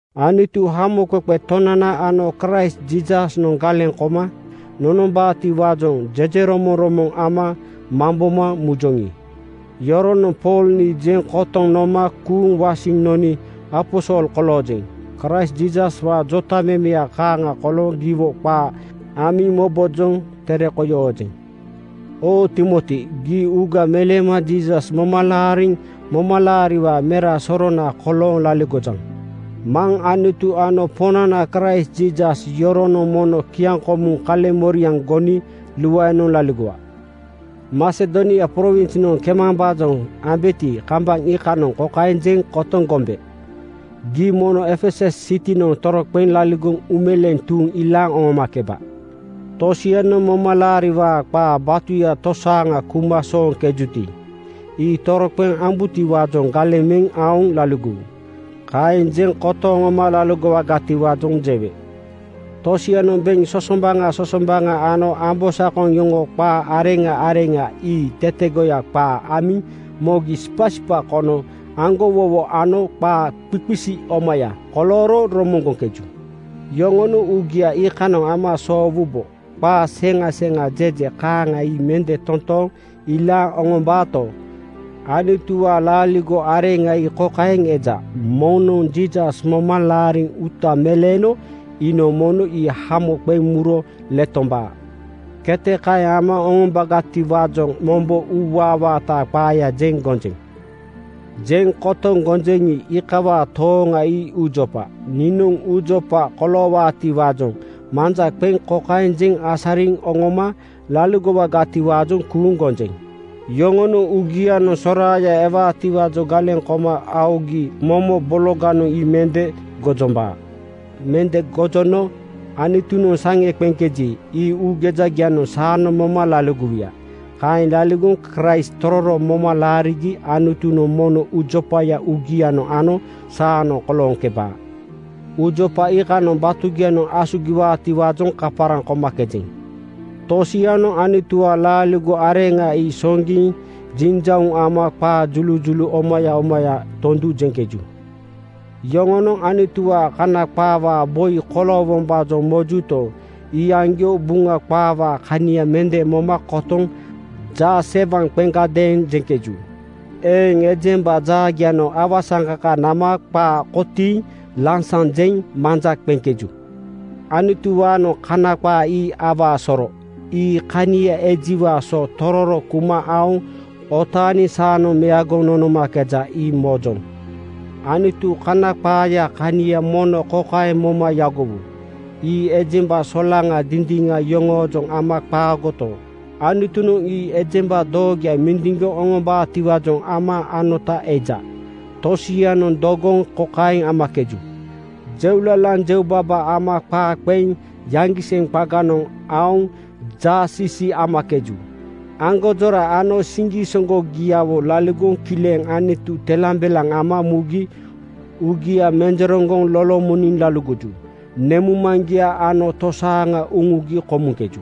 Anutu, Hamoqeqe Tonana ano Kraist Jiisasnoŋ galeŋ koma nonombaatiwaajoŋ jejeromoŋromoŋ ama mamboma mujoŋi, iyoronoŋ Pool nii jeŋ kotoŋ noma kuuŋ wasiŋ noni aposol koloojeŋ. Kraist Jiisaswaa jotamemeya kaaŋa kolooŋ giwo qaa amiŋ mobojoŋ tere koi oojeŋ. Oo Timoti! Gii uuga meleema Jiisas moma laariŋ momalaariwaa mera sorona kolooŋ laligojaŋ. Maŋ Anutu ano Poŋnana Kraist Jiisas, yoronoŋ mono kiaŋkomuŋ kaleŋmoriaŋ goni luaenoŋ laligowa. Masedonia prowinsnoŋ kemambaajoŋ ambeti, kambaŋ iikanoŋ kokaeŋ jeŋ kotoŋ gombe, ‘Gii mono Efesus sitinoŋ toroqeŋ laligoŋ uumeleeŋ tuuŋ ilaaŋ oŋomakeba. Tosianoŋ momalaariwaa qaa batuya tosaaŋa kuma sooŋkejuti, ii toroqeŋ ambubotiwaajoŋ galeŋ meŋ aoŋ laligowu.’ Kaeŋ jeŋ kotoŋ oŋoma laligowagatiwaajoŋ jewe. Tosianoŋ beŋ sosombaŋa sosombaŋa ano ambosakoŋ yoŋoo qa areŋa areŋa ii tetegoya qaa amiŋ mogi sipasipa kono aŋgowowo ano qaa qiqisi omaya kolooro romoŋgoŋkeju. Yoŋonoŋ uugia iikanoŋ ama soowubo. Qaa seŋa seŋa jeje kaaŋa ii mende totooŋ ilaaŋ oŋombaato, Anutuwaa laaligo areŋa ii kokaeŋ eja, ‘Moŋnoŋ Jiisas moma laariŋ uuta meleeno iinoŋ mono ii hamo qeŋ muro letombaa.’ Kete kaeŋ ama oŋombagatiwaajoŋ mombo uuwaa-waataa qaaya jeŋ gonjeŋ. Jeŋ kotoŋ gonjeŋi, iikawaa tooŋa ii uujopa. Niinoŋ uujopa koloowaatiwaajoŋ manja qeŋ kokaeŋ jeŋ asariŋ oŋoma laligowagatiwaajoŋ kuuŋ gonjeŋ: Yoŋonoŋ uugianoŋ soraaya ewaatiwaajoŋ galeŋ koma aogi momo bologanoŋ ii mende gojombaa. Mende gojono Anutunoŋ saŋe qeŋkeji, ii uugejagianoŋ saanoŋ moma laligowuya. Kaeŋ laligoŋ Kraist tororo moma laarigi Anutunoŋ mono uujopaya uugianoŋ ano saanoŋ kolooŋkebaa. Uujopa iikanoŋ batugianoŋ asugiwaatiwaajoŋ kaparaŋ komakejeŋ. Tosianoŋ Anutuwaa laaligo areŋa ii soŋgiŋ jinjauŋ ama qaa julujulu omaya omaya tondu jeŋkeju. Yoŋonoŋ Anutuwaa Kana qaawaa boi koloowombaajoŋ mojuto, iyaŋgio Buŋa qaawaa kania mende moma kotoŋ jaasewaŋ qeŋgadeeŋ jeŋkeju. Eeŋ ejemba jaagianoŋ awasaŋkaka nama qaa kotiiŋ lansaŋ jeŋ manja qeŋkeju. Anutuwaanoŋ Kana qaa ii awaa soro. Ii kania ejiwaa so tororo kuma aoŋ otaaniŋ saanoŋ meagoŋ nonomakeja, ii mojoŋ. Anutu Kana qaayaa kania mono kokaeŋ moma yagowu: Ii ejemba solaŋa dindiŋa yoŋoojoŋ ama qaagoto, Anutunoŋ ii ejemba doogoya mindiŋgoŋ oŋombaatiwaajoŋ ama anota eja. Tosianoŋ dogoŋ kokaeŋ amakeju: Jeulalaŋ jeubaba ama qaa qeŋ yaŋgiseŋ qaganoŋ aoŋ jaasiisii amakeju. Aŋgonjora ano siŋgisoŋgogiawo laligoŋ kileŋ Anutu telambelaŋ ama mugi uugia menjereŋgoŋ lolomoniŋ laligoju. Nemuŋmaŋgia ano tosaaŋa uŋugi komuŋkeju.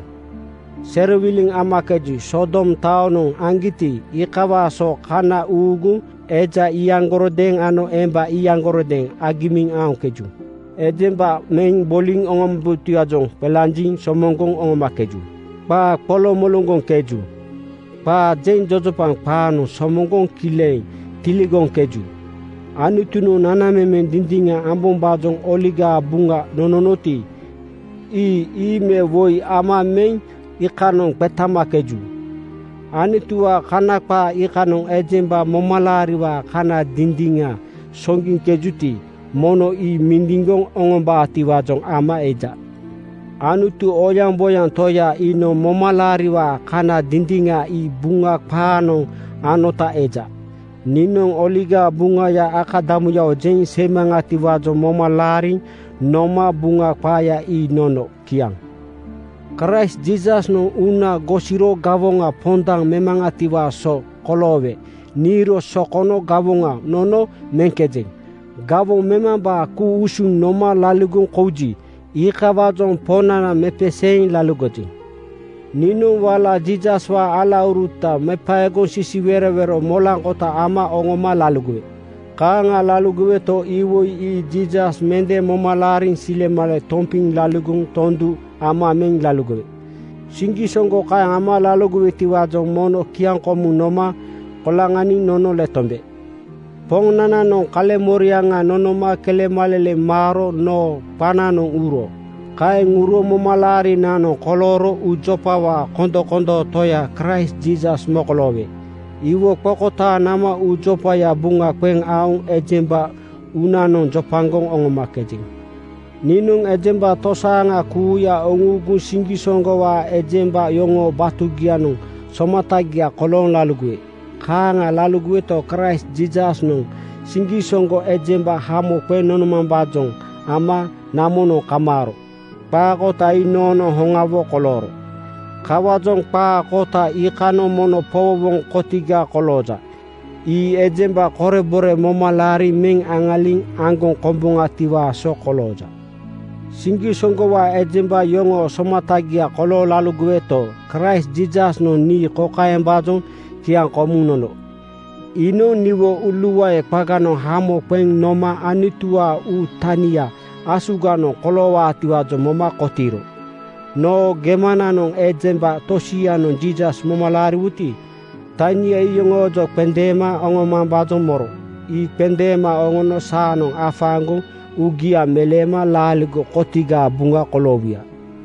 Serowiliŋ amakeju. Sodom taonoŋ aŋgiti, iikawaa so kana uuguŋ eja iyaŋgarodeeŋ ano emba iyaŋgarodeeŋ agimiŋ aoŋkeju. Ejemba meŋ boliŋ oŋombutiwaajoŋ qelanjiŋ somoŋgoŋ oŋomakeju. Qaa qoloŋmoloŋgoŋkeju. Qaa jeŋ jojopaŋ qaanoŋ somoŋgoŋ kileŋ tiligoŋkeju. Anutunoŋ nanamemeŋ dindiŋa ambombaajoŋ Oligaa Buŋa nononoti, ii ii me woi ama meŋ iikanoŋ qetamakeju. Anutuwaa Kana qaa iikanoŋ ejemba momalaariwaa kana dindiŋa soŋgiŋkejuti, mono ii mindiŋgoŋ oŋombaatiwaajoŋ ama eja. Anutu, oyaŋboyaŋ Toya iinoŋ momalaariwaa kana dindiŋa ii Buŋa qaanoŋ anota eja. Niinoŋ Oligaa Buŋaya akadamuyawo jeŋ seimaŋatiwaajoŋ moma laariŋ noma Buŋa qaaya ii nono. Kiaŋ. Kraist Jiisasnoŋ uuna gosiro gawoŋa pondaŋ memaŋatiwaa so koloowe niiro sokono gawoŋa nono meŋkejeŋ. Gawoŋ memambaa ku-usuŋ noma laligoŋ kouji, iikawaajoŋ Poŋnana mepeseeŋ laligojeŋ. Niinoŋ wala Jiisaswaa alauruta mepaegoŋ sisiwerowero molaŋkota ama oŋoma laligowe. Kaaŋa laligoweto, iwoi ii Jiisas mende moma laariŋ silemale tompiŋ laligoŋ tondu ama meŋ laligowe. Siŋgisoŋgo kaeŋ ama laligowetiwaajoŋ mono kiaŋkomuŋ noma koloŋaniŋ nono letombe. Poŋnananoŋ kaleŋmoriaŋa noma kelemaleleŋ maaro noo qananoŋ uro. Kaeŋ uro momalaarinanoŋ kolooro uujopawaa kondomondoo Toya Kraist Jiisas mokoloowe. Iwo qokotaaŋ nama uujopaya buŋa qeŋ aoŋ ejemba uunanoŋ jopagoŋ oŋomakejeŋ. Niinoŋ ejemba tosaaŋa kuuya uŋuuguŋ siŋgisoŋgowaa ejemba yoŋoo batugianoŋ somatagia kolooŋ laligowe. Kaaŋa laligoweto, Kraist Jiisasnoŋ siŋgisoŋgo ejemba hamo qeŋ nonomambaajoŋ ama namonoŋ kamaaro. Qaa kota ii noonoŋ hoŋawo kolooro. Kawaajoŋ qaa kota iikanoŋ mono powowoŋ kotiga kolooja. Ii ejemba korebore moma laariŋ meŋ aŋaliŋ aŋgoŋ komboŋatiwaa so kolooja. Siŋgisoŋgowaa ejemba yoŋoo somatagia kolooŋ laligoweto, Kraist Jiisasnoŋ nii kokaembaajoŋ kiaŋkomuŋ nono: Iinoŋ niwo uuluae qaganoŋ hamo qeŋ noma Anutuwaa uu tania asuganoŋ koloowaatiwaajoŋ moma kotiiro. Noo gemananoŋ ejemba tosianoŋ Jiisas moma laariwuti, tania ii iyoŋoojoŋ qendeema oŋomambaajoŋ moro. Ii qendeema oŋono saanoŋ afaaŋgoŋ uugia meleema laaligo kotigaa buŋa koloowuya.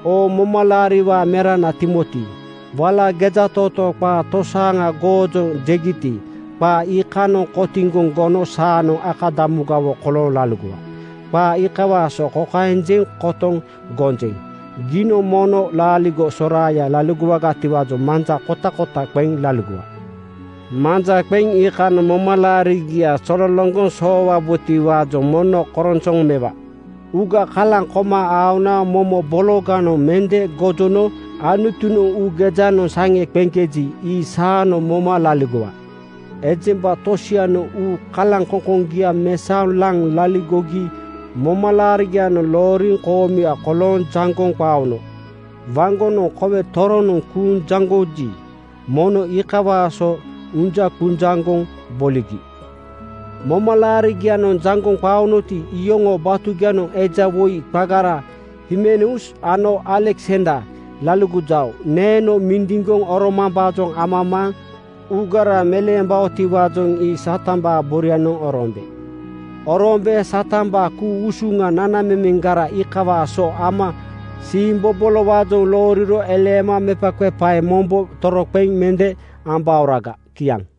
Oo momalaariwaa merana Timoti! Wala gejatootoo qaa tosaaŋa goojoŋ jegiti, qaa iikanoŋ kotiŋgoŋ gono saanoŋ akadamugawo kolooŋ laligowa. Qaa iikawaa so kokaeŋ jeŋ kotoŋ gonjeŋ: Giinoŋ mono laaligo soraaya laligowagatiwaajoŋ manja kotakota qeŋ laligowa. Manja qeŋ iikanoŋ momalaariga zololoŋgoŋ soowabotiwaajoŋ mono koronsoŋ mewa. Uuga kalaŋ koma aona momo bologanoŋ mende gojono Anutunoŋ uugejanoŋ saŋe qeŋkeji, ii saanoŋ moma laligowa. Ejemba tosianoŋ uu kalaŋkoŋkoŋgia mesaoŋ laŋ laligogi momalaarigianoŋ looriŋ koomuya kolooŋ jaŋgoŋ qaono. Waŋgonoŋ kowe toronoŋ kuuŋ jaŋgoji, mono iikawaa so unjaŋqunjaŋgoŋ boligi. Momalaarigianoŋ jaŋgoŋ qaonoti, iyoŋoo batugianoŋ eja woi qagara Himeneus ano Aleksander laligojao. Neeno mindiŋgoŋ oromambaajoŋ amamaaŋ uugara meleembaotiwaajoŋ ii Satambaa borianoŋ oroombe. Oroombe Satambaa ku-usuŋa nanamemeŋgara iikawaa so moma uugara siimbobolowaajoŋ looriro eleema mepaqepae mombo toroqeŋ mende ambaoraga. Kiaŋ.